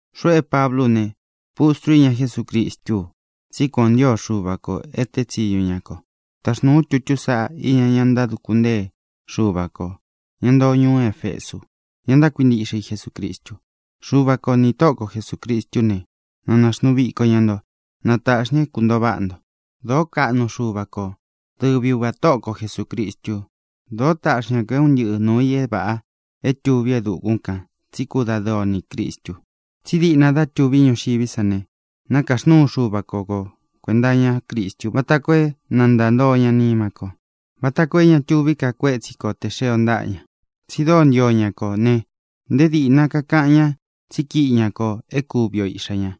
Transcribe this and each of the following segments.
Xuꞌu é Pablú u ne, pustru íña Jesúcristú u tsí kuan ō ntío Xuva kō é tēé tsiñu ña ko. Taxnūu ú tutú sāꞌá iña ña ntáduku ntée Xuva kō, ña ntoo ñuú Efesu, ña ntákuintiꞌxe i Jesucristu. Xuva ko nī Tóꞌo ko Jesūcristú ne, na nāxnuu viko ña nto. Na tāꞌxi ña é kuntōo váꞌa nto. Dōó kaꞌnu Xuva ko, dɨvi Uvā Tóꞌo ko Jesūcristu. Dōo táꞌxi ña kō é un ntɨꞌɨ nūu i é vāꞌa é tuví e dukún kān tsi kúdadɨɨ o nī Cristu. Tsí diꞌna dá tuví ñuxiví san ne, nākaxnúu Xuva ko ko kuēnta iñá Cristu vata koo é na ntāntoo ña nima kó, vata koo é ña tuví ka kuétsi ko tē xee o ntaꞌa ña. Tsi dóo ntío ña kō ne, nté dīꞌna kakaꞌan ñá tsí kiꞌi ña kō é kuvi o iꞌxā ñá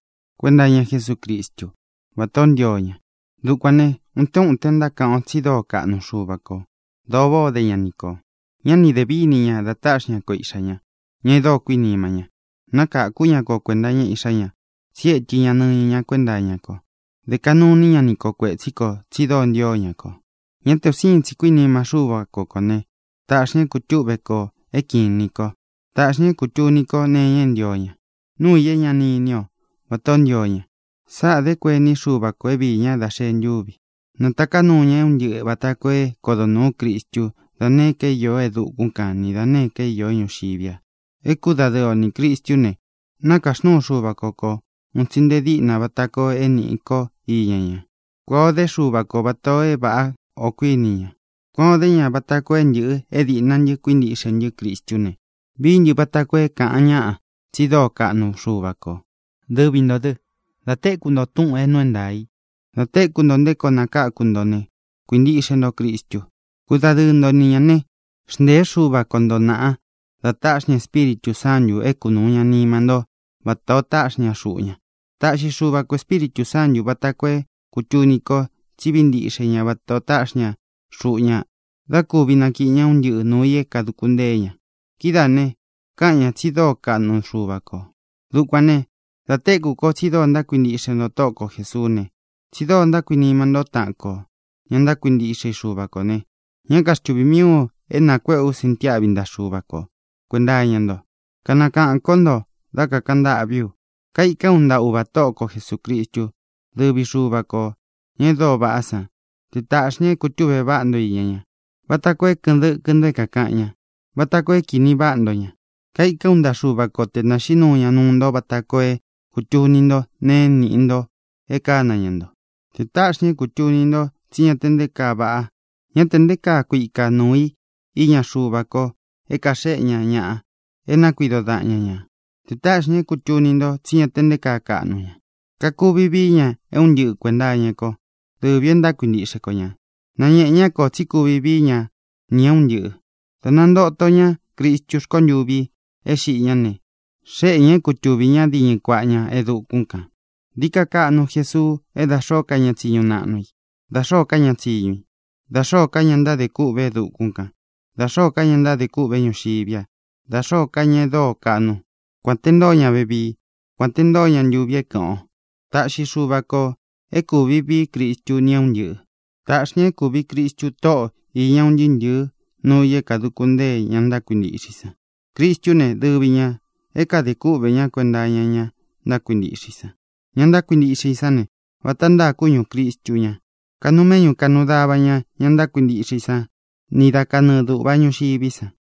kuenta iña Jesúcristu, váta ō ntío ña. Dukuān né, utén uten ntákaꞌan o tsi dóo kaꞌnu Xuva kō. Dōo váꞌā o dé ña ni kō. Ñá ni dē víni ña da táꞌxi ñá ko Iꞌxā ña, ña e dóo kuinima ña. Nákakū ñá ko kuēnta iña Iꞌxá ña, tsi étɨ ña nɨñɨ ña kuénta iña ko. Dē kaꞌnu iní ña ni kō kuetsí kō, tsi dóo ntio ña kō. Ñá te un sīin tsi kuínima Xúva ko kō ne, tāꞌxi ña é kūtúꞌve kō, é kiꞌin inī ko. Tāꞌxi ña é kūtuni ko nee iña é ntio ña, nuu i é ña ni iní ō, vata ō ntío ña. Sáꞌā dé kuení Xuva kō é viī ña dá xēe ntúvi i. Natāká nuu ña é un ntɨꞌɨ vāta koo é kodo nūú Cristú da nēé ka é īó e dukún kan ni da nēé ka é īó ñuxiví a. É kudadɨɨ o nī Cristú ne, nākaxnúu Xuva ko ko ūun tsi nte díꞌna vata koo é nīꞌi ko íña ña. Kuān o dé Xuva ko vatā o é vāꞌá o kuíni ña. Kuān o dé ña vata koo é ntɨ̄ꞌɨ, é dīꞌna ntɨ́ kuintiꞌxe ntɨ́ Cristú ne, vií ntɨ vata koo é kāꞌan ñáꞌa tsi dóo kaꞌnu Xuva kō. Dɨvi ntō dɨ, dá tekū nto túꞌūn é nuu é ntaā i, dá tekū nto nté koo nakáku nto ne, kuīntiꞌxe nto Cristu. Kudadɨɨ nto ni ñā né, xntēé Xuva ko nto nāꞌa da táꞌxi ña Espíritū Sántū é kunūu ña nima ntó vata ō táꞌxi ña xuꞌu ña. Taꞌxi Xuva ko Ēspíritū Sántu vāta koo é kūtuni ko tsí vií ntiꞌxe ña vata ō táꞌxi ña xuꞌu ña dá kūvi nakiꞌi ña é un ntɨꞌɨ nūu i é kāduku ntée ña. Kidáā ne, kaꞌan ñáꞌa tsi dóo kaꞌnu Xuva kō. Dukuān ne, da téku ko tsi dóo ntákuintiꞌxe nto Tóꞌo ko Jēsuú ne, tsi dóo ntákuinima nto taꞌan ko, ña ntákuintiꞌxe i Xuva kō ne, ñá kaxtuvī mií u é nakuéꞌe ú sintiáꞌvi ntaꞌa Xuva ko kuēnta iña nto. Kanakaꞌān kó nto dá kakāꞌan ntâꞌví u. Kaikán u ntaꞌa Uvā Tóꞌo ko Jesūcristú, dɨvi Xuva kō, ña e dóo vaꞌá san, te tāꞌxi ña é kūtúꞌve váꞌa nto iña ña, vata koo é kɨ̄ꞌɨn dɨkɨ nto é kākaꞌan ña, vata koo é kīní vaꞌa ntó ña. Kaikán u ntaꞌa Xuva ko te nāxiꞌí nuu ña nuu nto vata koo é kūtuni ntó nēe é nīꞌi nto é kāna ña nto. Te tāꞌxi ña é kūtuni nto tsí ña te nté kaa vaꞌa, ña te nté kaa kuika nuu i iña Xuva ko é kaxéꞌe ña ñaꞌa é nakuido daꞌan ñā. Te tāꞌxi ña é kūtuni nto tsí ña te nté kaa kaꞌnu ña. Kakuvi vií ña é un ntɨꞌɨ kuēnta iña kó, dɨvi ō e ntákuintiꞌxe ko ñā. Nañēꞌe ñá kō tsí kuvi vií ña nī é un ntɨꞌɨ̄ dá nantōto ñá Cristú rkontuvi é xiꞌi ñá ne, xéꞌe ñā é kutuvī ñá diñɨ kuaꞌa ña e dukún kān. Dií ka kaꞌnu Jesuu é da xōó ka ña tsiñu naꞌnu i, da xōó ka ña tsiñu i, da xōó ka ña ntádē kûꞌvé e dukún kan, da xōó ka ña ntádē kûꞌvé ñuxiví a, da xōó ka ña e dóo kaꞌnu, kuān te ntóo ña vevii, kuān te ntóo ña ntuvi é kɨ̄ꞌɨn o. Taꞌxi Xuva kō é kūvi vií Cristu ni é un ntɨꞌɨ̄. Tāꞌxi ña é kūvi Cristu tóꞌo īña un ntɨɨ́ ntɨ̄ɨ́ nuu i é kāduku ntée ña ntákuintiꞌxe i san. Cristú ne, dɨvi ñā é kadē kúꞌvē ñá kuenta iña ña ntákuintiꞌxe i san. Ña ntákuintiꞌxe i sán ne, vata ntáa kúñū Cristu ña. Kanuu méꞌñu kanuu dava ña ña ntákuintiꞌxe i sán ni da kanɨɨ dūꞌva ñuxiví san.